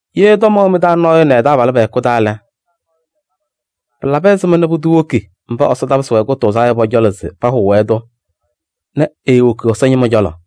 Ye tɔm ɛwɛ mɩ-taa nɔɔyʋ nɛ ɛ-taabalʋ pɛ-hɛkʋ taa lɛ, pɩlabɩ ɛzɩma nɛ pʋdʋ woki mba Ɛsɔ tapɩsɩ-wɛ kʋtʋʋzaa yɔ pɔ-cɔlɔ se pahʋʋ-wɛ-tʋ nɛ eewoki Ɛsɔ ñɩma cɔlɔ?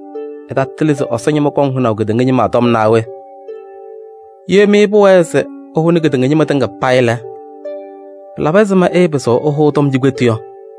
Ɩtatɩlɩ se Ɛsɔ ñɩma kɔŋnɩ hʋnaʋ kedeŋa ñɩma tɔm naa we? Ye mɩ pʋwɛɛ se ɩhʋnɩ kedeŋa ñɩma tɩŋa payɩ lɛ, pɩlabɩ ɛzɩma ɩɩpɩzɩɣ ɩhʋʋ tɔm cikpetu yɔ?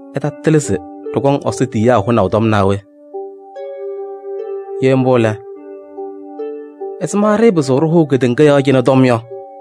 Ɩtatɩlɩ se ɖɩkɔŋ Ɛsɔ tiyiyaa tɔm hʋnaʋ naa we? Ye mbʋ lɛ, ɛzɩma ɖɩɩpɩzɩɣ ɖɩhʋʋ kedeŋa yɔɔ cɩnɛ tɔm yɔ?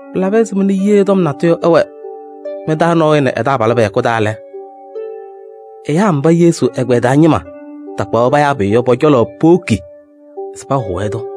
Pɩlabɩ ɛzɩma nɛ ye tɔm natʋyʋ ɛwɛ mɩ-taa nɔɔyʋ nɛ ɛ-taabalʋ pɛ-hɛkʋ taa lɛ, ɛyaa mba Yesu ɛgbɛyɛ taa ñɩma takpaɣ-wɛ payaa pʋyʋ yɔ, pɔ-cɔlɔ powoki se pahʋʋ-wɛ-tʋ?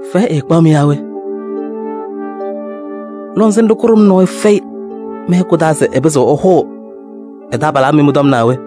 Fɛyɛ ɛɛkpaɣ-mɩ yaa we? Lɔŋsɩnɖʋ kʋɖʋm nɔɔyʋ fɛyɩ mɩ-hɛkʋ taa se ɛpɩzɩɣ ɛhʋʋ ɛ-taabalaa mɩ mɩ-tɔm naa we?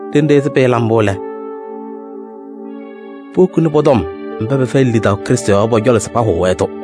Ɖenɖe ɛzɩ pɩɩla mbʋ lɛ, powokini pɔ-tɔm mba pɛfɛyɩnɩ lidaʋ Krɩstʋ yɔɔ yɔ pɔ-cɔlɔ se pahʋʋ-wɛ-tʋ.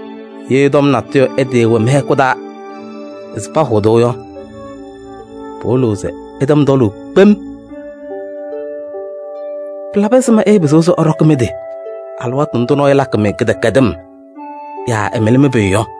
Ye tɔm natʋyʋ ɛtɩɩwɛ mɩ-hɛkʋ taa se pahʋʋ-tʋ yɔ, pɩwɩlɩɣ se ɩtɛm tɔlʋʋ kpem. Pɩlabɩ ɛzɩma ɩɩpɩzɩɣ se ɩɖɔkɩ mɩ-tɩ alɩwaatʋ ndʋ nɔɔyʋ lakɩ-mɩ kɩdɛkɛdɩm yaa ɛmɩlɩ mɩ-pʋyʋ yɔ?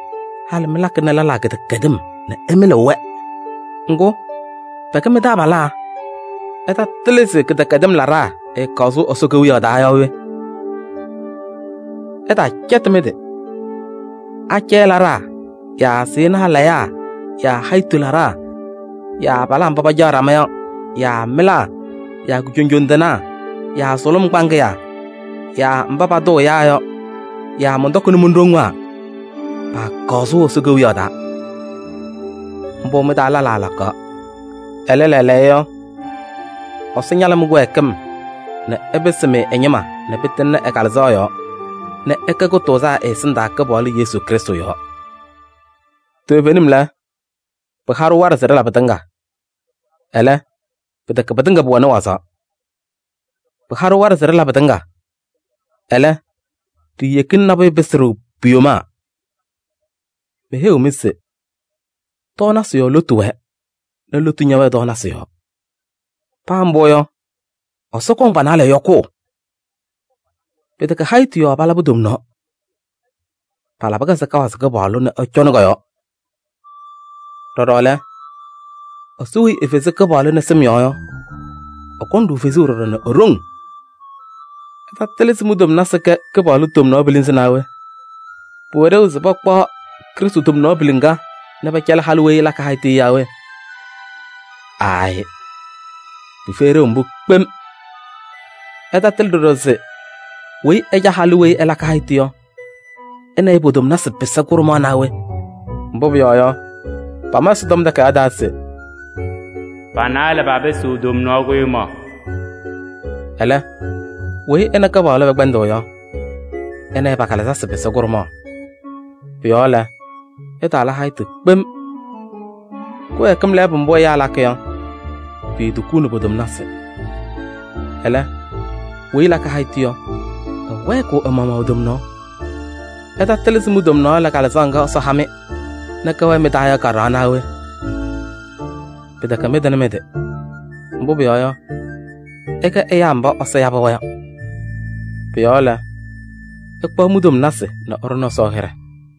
Halɩ mɩlakɩnɩ lɛlaa kɩdɛkɛdɩm nɛ ɩmɩlɩɣ-wɛ. Ŋgʋ, pɛkɛ mɩ-taabalaa! Ɩtatɩlɩ se kɩdɛkɛdɩm laɖaa ɛɛkaɣ sʋʋ Ɛsɔ Kewiyaɣ taa yaa we? Ɩtaacɛtɩ mɩ-tɩ: acɛyɛ laɖaa yaa sɩɩnaa layaa yaa hayitu laɖaa yaa abalaa mba pacaɣ ɖama yɔ yaa mɩlaa yaa kujoŋjoŋ tɩnaa yaa sʋlʋm kpaŋɩyaa yaa mba patʋʋ ɛyaa yɔ yaa mɔntɔkɩnɩ mon-ɖoŋwaa paakaɣ sʋʋ Ɛsɔ Kewiyaɣ taa. Mbʋ mɩ-taa lɛlaa lakaɣ. Ɛlɛ lɛɛlɛɛyɔ, Ɛsɔ ñalɩ mɩ-kɩwɛɛkɩm nɛ ɛpɩsɩ-mɩ ɛ-ñɩma nɛ pɩtɩŋnɩ ɛ-Kalɩzaɣ yɔɔ nɛ ɩkɛ kʋtʋʋzaa ɛ-ɛsɩndaa Kɩpaɣlʋ Yesu Krɩstʋ yɔɔ. Toovenim lɛ: “Pɩha-ɖʋ waɖɛ se ɖɩla pɩtɩŋa,” ɛlɛ, pɩtɛkɛ pɩtɩŋa pʋwɛnɩ wazaɣ. “Pɩha-ɖʋ waɖɛ se ɖɩla pɩtɩŋa,” ɛlɛ, ɖiiyeki se nabʋyʋ ɛpɩsɩ-ɖʋ pu-yomaa. Meheyiɣ-mɩ se: “Tɔɔnasɩ yɔɔ lotu wɛɛ nɛ lotu ñɛwɛɛ tɔɔnasɩ yɔɔ.” Paa mbʋ yɔ, Ɛsɔ kɔŋ pa-naalɛ yɔkʋʋ. Pɩtɛkɛ hayitu yɔɔ palabɩ tomnaɣ: palabɩ-kɛ se kawazɩ Kɩpaɣlʋ nɛ ɛcɔnɩ kɔ-yɔɔ. Ɖɔɖɔ lɛ, Ɛsɔ weyi efezi Kɩpaɣlʋ nɛ sɩm yɔɔ yɔ, ɛkɔŋ-ɖʋ fezuu ɖɔɖɔ nɛ e-ɖoŋ. Ɩtatɩlɩ se mi-tomnasɩ kɛ Krɩstʋ tomnaɣ pilinzi naa we? Pʋwɛ ɖeu se pakpaɣ Krɩstʋ tomnaɣ piliŋa nɛ pɛcɛlɩ halʋ weyi ɛlakɩ hayitu yɔ yaa we? Aayɩ! Pɩfɛyɩ ɖeu mbʋ kpem. Ɩtatɩlɩ ɖɔɖɔ se weyi ɛca halʋ weyi ɛlakɩ hayitu yɔ, ɛ nɛ ɩ po-tomnasɩ pɩsɩ kʋɖʋmaɣ naa we? Mbʋ pʋyɔɔ yɔ, pama Ɛsɔtɔm Takayaɣ taa se: “Pa-naalɛ papɩsɩɣ tomnaɣ kʋɖʋmaɣ.” Ɛlɛ, weyi ɛ nɛ Kɩpaɣlʋ pɛkpɛndɩɣ yɔ, ɛ nɛ ɩ pa-kalɩzasɩ pɩsɩ kʋɖʋmaɣ. Pʋ-yɔɔ lɛ, ɩtaala hayitu kpem. Kɩwɛɛkɩm lɛɛbʋ mbʋ ɛyaa lakɩ yɔ, piitukuuni po-tomnasɩ. Ɛlɛ, weyi ɛlakɩ hayitu yɔ, ɛwɛɛkɩɣ ɛ-maɣmaɣ e-tomnaɣ. Ɩtatɩlɩ se mi-tomnaɣ lɛ Kalɩzaɣ ŋga Ɛsɔ ha-mɩ nɛ kɛwɛɛ mɩ-taa yɔ ka-ɖɩɣa naa we? Pɩtɛkɛ mɩtɩnɩ mɩ-tɩ. Mbʋ pʋyɔɔ yɔ, ɩkɛ ɛyaa mba Ɛsɔ yabɩ-wɛ yɔ. Pʋ-yɔɔ lɛ, ɩkpaɣ mi-tomnasɩ nɛ ɩɖʋnɩ Ɛsɔ hɩɖɛ.